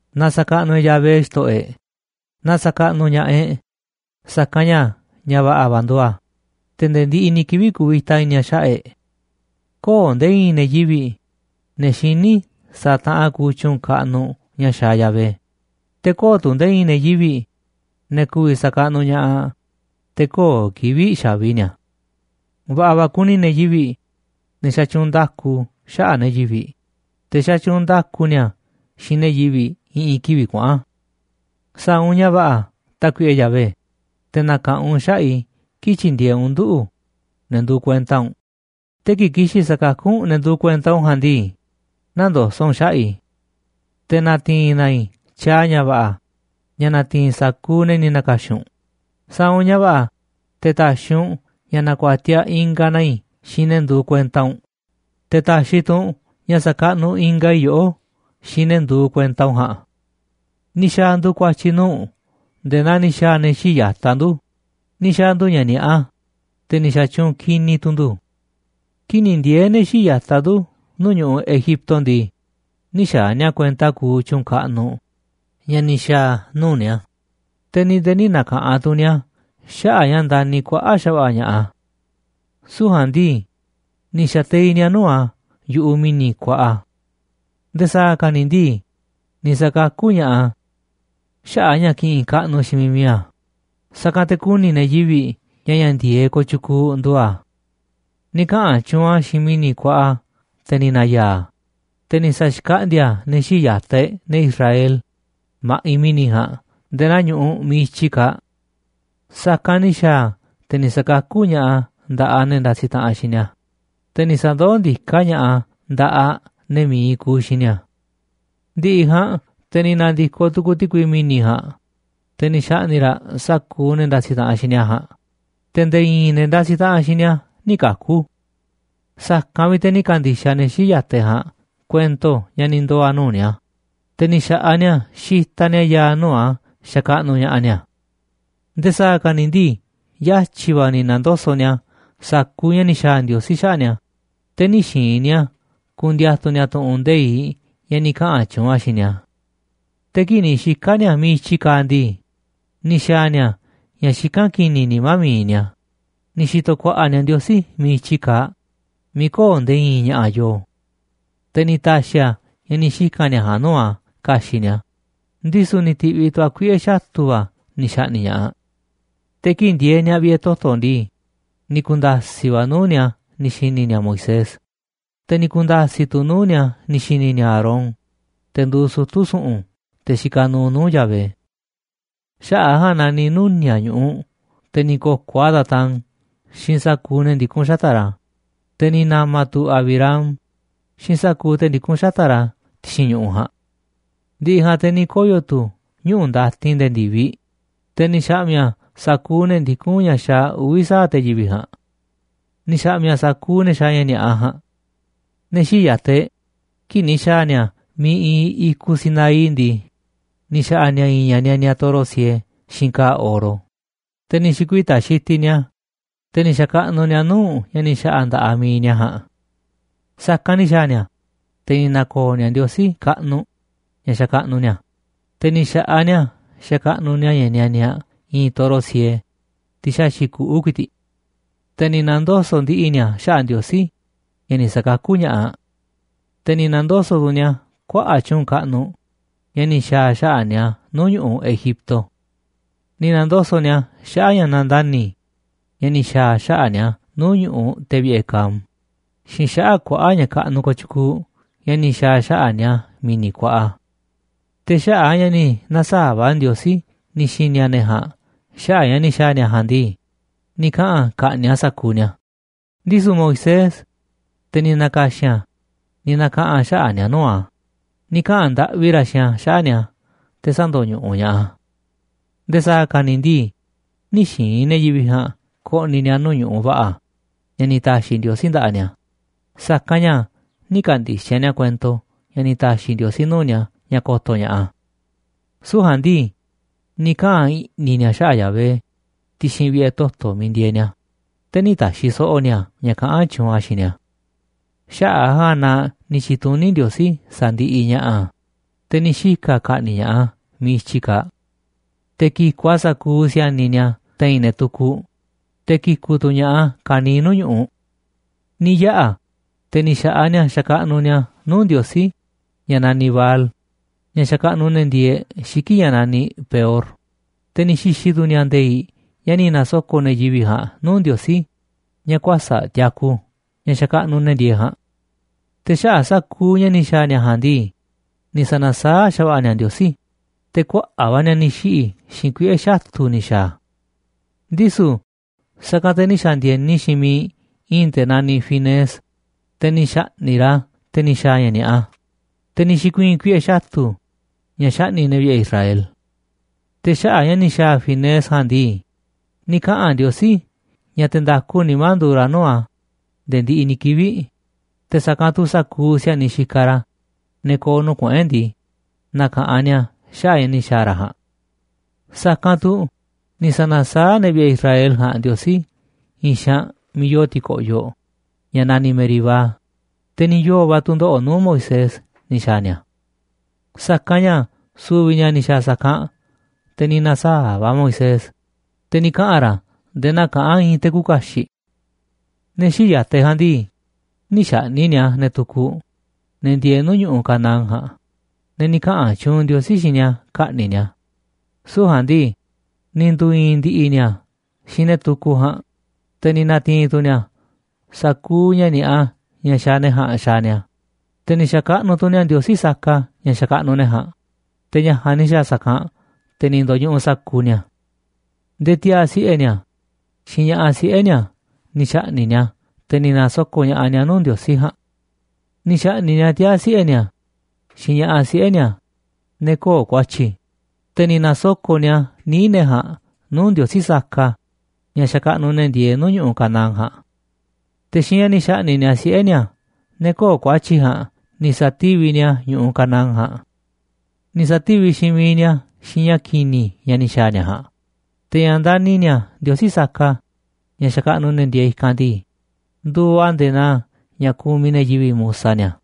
Na sa̱kaꞌnuꞌ e̱ꞌ Yahvé, xto̱ꞌo̱ e̱ꞌ. Na sa̱kaꞌnuꞌ ña̱ꞌaꞌ e̱ꞌ, sa̱kanꞌ ña̱ ña̱ va̱ꞌa̱ va̱ nduuꞌ a̱, te̱ nde̱e̱ ndiꞌiꞌ ni̱ kivi̱ꞌ kuvita i̱ni̱ a̱ xaꞌa̱ꞌ e̱ꞌ. Köo̱ꞌ nde̱e̱ i̱i̱n ne̱ yivi̱ꞌ, ne̱ xiní sa̱a̱ taꞌanꞌ kuuꞌ tyu̱u̱n kaꞌnuꞌ ña̱ xaaꞌ Yahvé, te̱ köo̱ꞌ tu̱ nde̱e̱ i̱i̱n ne̱ yivi̱ꞌ, ne̱ ku̱vi̱ sa̱kaꞌnuꞌ ña̱ꞌaꞌ, te̱ köo̱ꞌ kivi̱ꞌ xa̱vi ni̱a̱. Va̱ꞌa̱ va̱ kuni ne̱ yivi̱ꞌ, ne̱ xatyuunꞌ nda̱ku xaꞌa̱ꞌ ne̱ yivi̱ꞌ, te̱ xatyuunꞌ nda̱ku ni̱a̱ xiinꞌ ne̱ yivi̱ꞌ i̱ꞌi̱n kivi̱ꞌ kuaꞌa̱n. Sa̱a̱ u̱nꞌ ña̱ va̱ꞌa̱, Tákuiꞌe Yahvé, te̱ na̱ka̱ꞌanꞌ u̱nꞌ xaꞌa̱ꞌ i̱ kii̱ꞌ tyi̱ndi̱e̱eꞌ u̱nꞌ nduꞌu̱, ne̱ nduuꞌ kuenta u̱nꞌ, te̱ kii̱ꞌ ki̱xi̱n sa̱kakú u̱nꞌ ne̱ nduuꞌ kuenta u̱nꞌ ja̱a̱nꞌ ndii, nä̱ndoso̱ꞌ u̱nꞌ xaꞌa̱ꞌ i̱. Te̱ na̱ti̱i̱n na̱ i̱ tyaaꞌ ña̱ va̱ꞌa̱ ña̱ na̱ti̱i̱n sa̱kuuꞌ ne̱ ni̱ na̱ka̱xi̱n u̱nꞌ, sa̱a̱ u̱nꞌ ña̱ va̱ꞌa̱ te̱ ta̱xi̱ u̱nꞌ ña̱ na̱ku̱a̱tiaꞌ ingaꞌ na i̱ xiinꞌ ne̱ nduuꞌ kuenta u̱nꞌ, te̱ ta̱xi̱ tu̱ u̱nꞌ ña̱ sa̱kaꞌnuꞌ ingaꞌ i̱ yoꞌó xiinꞌ ne̱ nduuꞌ kuenta u̱nꞌ ja̱a̱nꞌ. Ni̱ xa̱a̱ ndu̱ ku̱a̱tyi̱ nuu̱ꞌ u̱nꞌ nde̱e̱ naa ni̱ xa̱a̱ ne̱ xii̱ꞌ ya̱taꞌ ndu̱, ni̱ xa̱a̱ ndu̱ ña̱ ni̱a̱ꞌa, te̱ ni̱ xa̱tyuunꞌ ki̱ni̱ tu̱ ndu̱. Kii̱ꞌ ni̱ ndiee̱ ne̱ xii̱ꞌ ya̱taꞌ ndu̱ nu̱uꞌ ñu̱ꞌuꞌ Egipto ndii, nï̱ xaaꞌ ni̱a̱ kuenta kuuꞌ tyu̱u̱n kaꞌnuꞌ ña̱ ni̱ xa̱a̱ a̱ nuu̱ꞌ ni̱a̱, te̱ ni̱ nde̱e̱ nï̱ na̱ka̱ꞌanꞌ tu̱ ni̱a̱ xaꞌa̱ꞌ ña̱ ndani̱ kuaꞌa̱ꞌ xa̱va̱ꞌa̱ ña̱ꞌaꞌ a̱. Süu̱ꞌ ja̱a̱nꞌ ndii, ni̱ xa̱teiꞌ ni̱a̱ nuu̱ꞌ a̱ yu̱ꞌuꞌ mi̱ni̱ kuaꞌa. Nde̱e̱ sa̱a̱ ka̱ ni̱ ndii, ni̱ sa̱kakú ña̱ꞌaꞌ a̱ xaꞌa̱ꞌ a̱ ña̱ kiꞌinꞌ kaꞌnuꞌ xiinꞌ miiꞌ mi̱iꞌ a̱, sa̱kanꞌ te̱ ku̱ni̱ ne̱ yivi̱ꞌ ña̱ ña̱ ndi̱e̱eꞌ kooꞌ tyukuuꞌ nduuꞌ a̱. Ni̱ kaꞌa̱n tyuunꞌ a̱ xiinꞌ mi̱ni̱ kuaꞌa, te̱ ni̱ na̱ya̱a̱ a̱, te̱ ni̱ sa̱xkaꞌndíá a̱ ne̱ xii̱ꞌ ya̱taꞌ e̱ꞌ, ne̱ Israel, ma̱ꞌiꞌ mi̱ni̱ ja̱a̱nꞌ nde̱e̱ naa ñu̱ꞌuꞌ miiꞌ i̱tyi kaaꞌ. Sa̱kanꞌ ni̱ xa̱a̱ a̱ te̱ ni̱ sa̱kakú ña̱ꞌaꞌ a̱ nda̱ꞌaꞌ ne̱ ndasiꞌ taꞌanꞌ xiinꞌ ni̱a̱, te̱ ni̱ sa̱ndoó ndiká ña̱ꞌaꞌ a̱ nda̱ꞌaꞌ ne̱ mi̱iꞌ kuuꞌ xiinꞌ ni̱a̱. Ndi̱ꞌi̱ ja̱a̱nꞌ te̱ ni̱ na̱ndi̱koꞌ tukuuꞌ ti̱kui mi̱ni̱ ja̱a̱nꞌ, te̱ ni̱ xa̱ꞌni̱ꞌ raꞌ sa̱kuuꞌ ne̱ ndasiꞌ taꞌanꞌ xiinꞌ ni̱a̱ ja̱a̱nꞌ, te̱ nde̱e̱ i̱i̱n ne̱ ndasiꞌ taꞌanꞌ xiinꞌ ni̱a̱ nï̱ kaku̱. Sa̱kanꞌ vi̱ꞌ te̱ ni̱ ka̱ndi̱xaꞌ ne̱ xii̱ꞌ ya̱taꞌ e̱ꞌ ja̱a̱nꞌ kuento ña̱ ni̱ ndoo̱ a̱ nuu̱ꞌ ni̱a̱, te̱ ni̱ xa̱ꞌaꞌ ni̱a̱ xitaꞌ ni̱a̱ ya̱a̱ nuu̱ꞌ a̱ xakaꞌnuꞌ ña̱ꞌaꞌ ni̱a̱. Nde̱e̱ sa̱a̱ ka̱ ni̱ ndii yatyi̱ va̱ ni̱ na̱ndoso̱ꞌ ni̱a̱ sa̱kuuꞌ ña̱ ni̱ xa̱a̱ Ndiosí xaꞌa̱ꞌ ni̱a̱, te̱ nï̱ xi̱i̱n ni̱a̱ ku̱ndi̱a̱tu̱ ni̱a̱ tu̱ꞌu̱n nde̱iꞌ ña̱ ni̱ kaꞌa̱n tyuunꞌ a̱ xiinꞌ ni̱a̱. Te̱ kii̱ꞌ ni̱ xika̱ ni̱a̱ miiꞌ i̱tyi kaaꞌ ndii, ni̱ xa̱a̱ ni̱a̱ ña̱ xikán ki̱ni̱ nimá mi̱iꞌ ni̱a̱, ni̱ xi̱to̱ ku̱a̱ꞌa̱ ni̱a̱ Ndiosí miiꞌ i̱tyi kaaꞌ miiꞌ köo̱ꞌ nde̱e̱ i̱i̱n ña̱ꞌa̱ yoo. Te̱ ni̱ ta̱xi̱ a̱ ña̱ ni̱ xika̱n ni̱a̱ ja̱a̱nꞌ nuu̱ꞌ a̱ ka̱xi̱ꞌ ni̱a̱, ndisu̱ ni̱ ti̱ꞌviꞌ tu̱ a̱ kuiꞌe̱ xatu̱ va̱ ni̱ xa̱ꞌni̱ꞌ ña̱ꞌaꞌ. Te̱ kii̱ꞌ ndieeꞌ ni̱a̱ vi̱ꞌe̱ toto̱ ndii, ni̱ ku̱nda̱si̱ꞌ va̱ nuu̱ꞌ ni̱a̱ ni̱ xi̱ni̱ ni̱a̱ Moisés, te̱ ni̱ ku̱nda̱si̱ꞌ tu̱ nuu̱ꞌ ni̱a̱ ni̱ xi̱ni̱ ni̱a̱ Aarón, te̱ nduuꞌ sutu̱ su̱ꞌu̱n, te̱ xikaꞌ nuuꞌ nuu̱ꞌ Yahvé. Xaꞌa̱ꞌ a̱ ja̱a̱nꞌ na ni̱ nuni̱a̱ꞌ ñu̱ꞌuꞌ, te̱ ni̱ ko̱koꞌ a̱ Datán xiinꞌ sa̱kuuꞌ ne̱ ndikún xata̱ꞌ ra̱, te̱ ni̱ na̱ma̱ tu̱ Abirám xiinꞌ sa̱kuuꞌ te̱ ndikún xata̱ꞌ ra̱ ti̱xi̱n ñu̱ꞌuꞌ ja̱a̱nꞌ. Ndi̱ꞌi̱ ja̱a̱nꞌ te̱ ni̱ koyo̱ tu̱ ñuꞌu̱ ndatin nde̱e̱ ndi̱viꞌ, te̱ ni̱ xa̱ꞌmi̱ a̱ sa̱kuuꞌ ne̱ ndikún ña̱ xaaꞌ uvi̱ sa̱aꞌ te̱ yivi̱ꞌ ja̱a̱nꞌ. Ni̱ xa̱ꞌmi̱ a̱ sa̱kuuꞌ ne̱ xaaꞌ ña̱ ni̱a̱ꞌa ja̱a̱nꞌ. Ne̱ xii̱ꞌ ya̱taꞌ e̱ꞌ, kii̱ꞌ ni̱ xa̱a̱ ni̱a̱ miiꞌ iinꞌ i̱kuꞌ Sinaí ndii, ni̱ xa̱ꞌa̱ ni̱a̱ i̱i̱n ña̱ nianiaꞌ toro siee xiinꞌ ka̱a̱ oro, te̱ ni̱ xi̱kuita̱ xitiꞌ ni̱a̱, te̱ ni̱ xa̱kaꞌnuꞌ ni̱a̱ nuu̱ꞌ ña̱ ni̱ xa̱ꞌa̱ nda̱ꞌaꞌ mi̱iꞌ ni̱a̱ ja̱a̱nꞌ. Sa̱kanꞌ ni̱ xa̱a̱ ni̱a̱, te̱ ni̱ na̱ko̱o̱ ni̱a̱ Ndiosí kaꞌnuꞌ ña̱ xakaꞌnuꞌ ni̱a̱, te̱ ni̱ xa̱ꞌaꞌ ni̱a̱ xa̱kaꞌnuꞌ ni̱a̱ ña̱ nianiaꞌ i̱i̱n toro siee, tiꞌ xaxi̱ꞌ kuꞌu̱ ku̱i̱ti̱ꞌ. Te̱ ni̱ na̱ndoso̱ꞌ ndi̱ꞌi̱ ni̱a̱ xaꞌa̱ꞌ Ndiosí ña̱ ni̱ sakakú ña̱ꞌaꞌ, te̱ ni̱ na̱ndoso̱ꞌ tu̱ ni̱a̱ kuaꞌa̱ꞌ tyu̱u̱n kaꞌnuꞌ ña̱ ni̱ xa̱a̱ a̱ xaꞌa̱ꞌ ni̱a̱ nuu̱ꞌ ñu̱ꞌuꞌ Egipto. Ni̱ na̱ndoso̱ꞌ ni̱a̱ xaꞌa̱ꞌ ña̱ nandani̱ ña̱ ni̱ xa̱a̱ a̱ xaꞌa̱ꞌ ni̱a̱ nuu̱ꞌ ñu̱ꞌuꞌ te̱ vi̱ꞌe̱ Cam xiinꞌ xaꞌa̱ꞌ kuaꞌa̱ꞌ ña̱ kaꞌnuꞌ kooꞌ tyukuuꞌ ña̱ ni̱ xa̱a̱ a̱ xaꞌa̱ꞌ ni̱a̱ mi̱ni̱ kuaꞌa. Te̱ xaꞌa̱ꞌ a̱ ña̱ ni̱ na̱saa̱ꞌ va̱ Ndiosí ni̱ xi̱ni̱ a̱ ne̱ ja̱a̱nꞌ xaꞌa̱ꞌ ña̱ ni̱ xa̱a̱ ni̱a̱ ja̱a̱nꞌ ndii, ni̱ kaꞌa̱n a̱ ka̱ꞌni̱ꞌ a̱ sa̱kuuꞌ ni̱a̱, ndisu̱ Moisés, te̱ ni̱ na̱ka̱xi̱n a̱, ni̱ na̱kaꞌa̱n xaꞌa̱ꞌ ni̱a̱ nuu̱ꞌ a̱, ni̱ kaꞌa̱n ndaꞌvi ra̱ xiinꞌ a̱ xaꞌa̱ꞌ ni̱a̱ te̱ sä̱ndo̱ñuꞌuꞌ ña̱ꞌaꞌ a̱. Nde̱e̱ sa̱a̱ ka̱ ni̱ ndii, nï̱ xi̱i̱n ne̱ yivi̱ꞌ ja̱a̱nꞌ ko̱ꞌni̱ ni̱a̱ nuu̱ꞌ ñu̱ꞌuꞌ va̱ꞌa̱ ña̱ ni̱ ta̱xi̱ Ndiosí nda̱ꞌaꞌ ni̱a̱, sa̱kanꞌ ña̱ nï̱ ka̱ndi̱xaꞌ ni̱a̱ kuento ña̱ ni̱ ta̱xi̱ Ndiosí nuu̱ꞌ ni̱a̱ ña̱ ko̱to̱ ña̱ꞌaꞌ a̱. Süu̱ꞌ ja̱a̱nꞌ ndii, ni̱ kaꞌa̱n i̱ꞌni̱ ni̱a̱ xaꞌa̱ꞌ Yahvé ti̱xi̱n vi̱ꞌe̱ toto̱ miiꞌ ndieeꞌ ni̱a̱, te̱ nï̱ ta̱xi̱ so̱ꞌo̱ ni̱a̱ ña̱ kaꞌán tyuunꞌ a̱ xiinꞌ ni̱a̱. Xaꞌa̱ꞌ a̱ ja̱a̱nꞌ na ni̱ tyi̱tuní Ndiosí sa̱ndiꞌiꞌ ña̱ꞌaꞌ a̱, te̱ ni̱ xika̱ a̱ ka̱ꞌni̱ꞌ ña̱ꞌaꞌ a̱ miiꞌ i̱tyi kaaꞌ. Te̱ ki̱ku̱ꞌ a̱ sa̱kuuꞌ si̱a̱niꞌ ni̱a̱ te̱i̱n ne̱ tukuꞌ, te̱ ki̱ku̱ꞌ tu̱ ña̱ꞌaꞌ a̱ ka̱niiꞌ nuu̱ꞌ ñu̱ꞌuꞌ. Ni̱ yaꞌa̱ te̱ ni̱ xa̱ꞌaꞌ ni̱a̱ xakaꞌnuꞌ ni̱a̱ nuu̱ꞌ ndiosí ña̱ naniꞌ Baal, ña̱ xakaꞌnuꞌ ne̱ ndieeꞌ xiki̱ꞌ ña̱ naniꞌ Peor, te̱ ni̱ xi̱xi̱ tu̱ ni̱a̱ nde̱i̱ꞌ ña̱ ni̱ na̱soko̱ꞌ ne̱ yivi̱ꞌ ja̱a̱nꞌ nuu̱ꞌ ndiosí ña̱ kuäsa̱ꞌ tiaku, ña̱ xakaꞌnuꞌ ne̱ ndieeꞌ ja̱a̱nꞌ. Te̱ xaꞌa̱ꞌ sa̱kuuꞌ ña̱ ni̱ xa̱a̱ ni̱a̱ ja̱a̱nꞌ ndii, ni̱ sa̱na̱saáꞌ xa̱va̱ꞌa̱ ni̱a̱ Ndiosí, te̱ kuaꞌa̱ꞌ va̱ ni̱a̱ ni̱ xiꞌi̱ xiinꞌ kuiꞌe̱ xatu̱ ni̱ xa̱a̱ a̱. Ndisu̱ sa̱kanꞌ te̱ ni̱ xa̱ndi̱e̱ni xiinꞌ miiꞌ i̱i̱n te̱ naniꞌ Finees, te̱ ni̱ xa̱ꞌni̱ꞌ ra̱ te̱ ni̱ xa̱a̱ ña̱ ni̱a̱ꞌa, te̱ ni̱ xi̱kuii̱n kuiꞌe̱ xatu̱ ña̱ xaꞌni̱ꞌ ne̱ vi̱ꞌe̱ Israel. Te̱ xaꞌa̱ꞌ ña̱ ni̱ xa̱a̱ Finees ja̱a̱nꞌ ndii, ni̱ kaꞌa̱n Ndiosí ña̱ te̱ nda̱ku nimá nduuꞌ ra̱ nuu̱ꞌ a̱ nde̱e̱ ndiꞌiꞌ ni̱ kivi̱ꞌ, te̱ sa̱kanꞌ tu̱ sa̱kuuꞌ si̱a̱niꞌ xikaꞌ ra̱, ne̱ ko̱o̱ nuu̱ꞌ kuꞌu̱n e̱ꞌ ndii, na̱ka̱ꞌanꞌ ni̱a̱ xaꞌa̱ꞌ ña̱ ni̱ xa̱a̱ ra̱ ja̱a̱nꞌ. Sa̱kanꞌ tu̱ ni̱ sa̱na̱saáꞌ ne̱ vi̱ꞌe̱ Israel ja̱a̱nꞌ Ndiosí i̱i̱n xaanꞌ miiꞌ yoo ti̱ko̱ꞌyoꞌ ña̱ naniꞌ Meribá, te̱ ni̱ yoo̱ va̱ tu̱ndoꞌo̱ꞌ nuu̱ꞌ Moisés ni̱ xa̱a̱ ni̱a̱. Sa̱kanꞌ ña̱ su̱vi̱ ni̱a̱ ni̱ xa̱a̱ sa̱kanꞌ, te̱ ni̱ na̱saa̱ꞌ va̱ Moisés, te̱ ni̱ kaꞌa̱n ra̱ nde̱e̱ naa kaꞌán i̱i̱n te̱ küuꞌ kaxiꞌ. Ne̱ xii̱ꞌ ya̱taꞌ e̱ꞌ ja̱a̱nꞌ ndii, nï̱ xa̱ꞌni̱ꞌ ni̱a̱ ne̱ tukuꞌ, ne̱ ndieeꞌ nuu̱ꞌ ñu̱ꞌuꞌ Canaán ja̱a̱nꞌ, ne̱ ni̱ kaꞌa̱n tyuunꞌ Ndiosí xiinꞌ ni̱a̱ ka̱ꞌni̱ꞌ ni̱a̱, süu̱ꞌ ja̱a̱nꞌ ndii, ni̱ ndu̱i̱i̱n ndi̱ꞌi̱ ni̱a̱ xiinꞌ ne̱ tukuꞌ ja̱a̱nꞌ, te̱ ni̱ na̱ti̱i̱n tu̱ ni̱a̱ sa̱kuuꞌ ña̱ ni̱a̱ꞌa ña̱ xaaꞌ ne̱ ja̱a̱nꞌ xaaꞌ ni̱a̱. Te̱ ni̱ xa̱kaꞌnuꞌ tu̱ ni̱a̱ ndiosí saka ña̱ xakaꞌnuꞌ ne̱ ja̱a̱nꞌ, te̱ ña̱ ja̱a̱nꞌ ni̱ xa̱a̱ sa̱kanꞌ, te̱ ni̱ ndo̱ñuꞌuꞌ sa̱kuuꞌ ni̱a̱. Nde̱e̱ tiaa̱ siꞌe̱ ni̱a̱ xiinꞌ ña̱ꞌaꞌ siꞌe̱ ni̱a̱ ni̱ xa̱ꞌni̱ꞌ ni̱a̱, te̱ ni̱ na̱soko̱ꞌ ña̱ꞌaꞌ ni̱a̱ nuu̱ꞌ ndiosí ja̱a̱nꞌ. Ni̱ xa̱ꞌni̱ꞌ ni̱a̱ tiaa̱ siꞌe̱ ni̱a̱ xiinꞌ ña̱ꞌaꞌ siꞌe̱ ni̱a̱, ne̱ köo̱ꞌ ku̱a̱tyi̱, te̱ ni̱ nasoko̱ꞌ ni̱a̱ níiꞌ ne̱ ja̱a̱nꞌ nuu̱ꞌ ndiosí saka ña̱ xakaꞌnuꞌ ne̱ ndieeꞌ nuu̱ꞌ ñu̱ꞌuꞌ Canaán ja̱a̱nꞌ. Te̱ xiinꞌ ña̱ ni̱ xa̱ꞌni̱ꞌ ni̱a̱ siꞌe̱ ni̱a̱, ne̱ köo̱ꞌ ku̱a̱tyi̱ ja̱a̱nꞌ, ni̱ sa̱tíviꞌ ni̱a̱ ñu̱ꞌuꞌ Canaán ja̱a̱nꞌ. Ni̱ sa̱tíviꞌ xiinꞌ miiꞌ ni̱a̱ xiinꞌ ña̱ ki̱ni̱ ña̱ ni̱ xa̱a̱ ni̱a̱ ja̱a̱nꞌ, te̱ ña̱ ndani̱ ni̱a̱ ndiosí saka ña̱ xakaꞌnuꞌ ne̱ ndieeꞌ i̱kanꞌ ndii, nduuꞌ a̱ nde̱e̱ naa ña̱ kumiꞌ ne̱ yivi̱ꞌ musa ni̱a̱.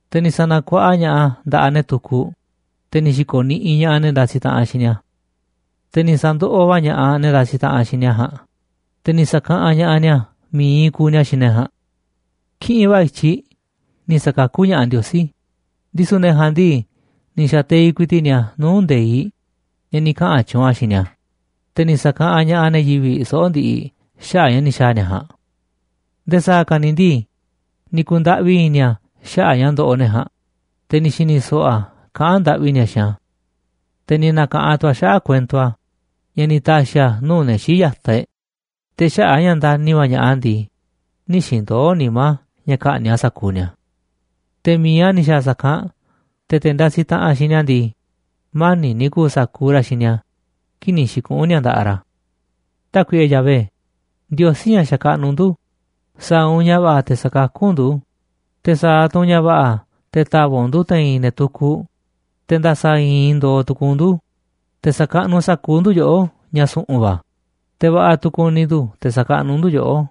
Te̱ ni̱ sa̱na̱kuaꞌa ña̱ꞌaꞌ a̱ nda̱ꞌaꞌ ne̱ tukuꞌ, te̱ ni̱ xi̱ko̱ niꞌiꞌ ña̱ꞌaꞌ ne̱ ndasiꞌ taꞌanꞌ xiinꞌ ni̱a̱. Te̱ ni̱ sa̱ndoꞌoꞌ va̱ ña̱ꞌaꞌ ne̱ ndasiꞌ taꞌanꞌ xiinꞌ ni̱a̱ ja̱a̱nꞌ, te̱ ni̱ sa̱kaꞌanꞌ ña̱ꞌaꞌ ni̱a̱ mi̱iꞌ kuuꞌ ni̱a̱ xiinꞌ ne̱ ja̱a̱nꞌ. Kiꞌinꞌ va̱ i̱tyiꞌ ni̱ sa̱kakú ña̱ꞌaꞌ Ndiosí, ndisu̱ ne̱ ja̱a̱nꞌ ndii, ni̱ xa̱teiꞌ ku̱i̱ti̱ꞌ ni̱a̱ nuu̱ꞌ nde̱iꞌ ña̱ ni̱ kaꞌa̱n tyuunꞌ a̱ xiinꞌ ni̱a̱, te̱ ni̱ sa̱kaꞌanꞌ ña̱ꞌaꞌ ne̱ yivi̱ꞌ soꞌo̱ꞌ ndiꞌiꞌ xaꞌa̱ꞌ ña̱ ni̱ xa̱a̱ ni̱a̱ ja̱a̱nꞌ. Nde̱e̱ sa̱a̱ ka̱ ni̱ ndii, ni̱ ku̱ndaꞌvi i̱ni̱ a̱ xaꞌa̱ꞌ ña̱ ndoꞌoꞌ ne̱ ja̱a̱nꞌ, te̱ ni̱ xi̱ni̱ so̱ꞌo̱ a̱ kaꞌán ndaꞌvi ni̱a̱ xiinꞌ a̱. Te̱ ni̱ na̱ka̱ꞌanꞌ tu̱ a̱ xaꞌa̱ꞌ kuento a̱ ña̱ ni̱ ta̱xi̱ a̱ nuu̱ꞌ ne̱ xii̱ꞌ ya̱taꞌ e̱ꞌ, te̱ xaꞌa̱ꞌ a̱ ña̱ ndani̱ va̱ ña̱ꞌaꞌ a̱ ndii, nï̱ xi̱ndoo̱ nimá ña̱ ka̱ꞌni̱ꞌ a̱ sa̱kuuꞌ ni̱a̱. Te̱ mi̱iꞌ a̱ ni̱ xa̱a̱ sa̱kanꞌ te̱ te̱ ndasiꞌ taꞌanꞌ xiinꞌ ni̱a̱ ndii, mani̱ꞌ ni̱ ku̱u̱ sa̱kuuꞌ ra̱ xiinꞌ ni̱a̱ kii̱ꞌ ni̱ xi̱kuꞌu̱n ni̱a̱ nda̱ꞌaꞌ ra̱. Tákuiꞌe Yahvé, Ndiosí ña̱ xakaꞌnuꞌ ndu̱, sa̱a̱ u̱nꞌ ña̱ va̱ꞌa̱ te̱ sa̱kakú u̱nꞌ ndu̱, te̱ sa̱a̱ tu̱ u̱nꞌ ña̱ va̱ꞌa̱ te̱ ta̱va̱ꞌ u̱nꞌ ndu̱ te̱i̱n ne̱ tukuꞌ, te̱ nda̱sa̱ i̱i̱n ndo̱o̱ tu̱ku̱u̱ u̱nꞌ ndu̱, te̱ sa̱kaꞌnuꞌ sa̱kuuꞌ ndu̱ yoꞌó, ña̱ su̱ꞌu̱n va̱, te̱ va̱ꞌa̱ tu̱ ku̱ni̱ ndu̱ te̱ sa̱kaꞌnuꞌ ndu̱ yoꞌó.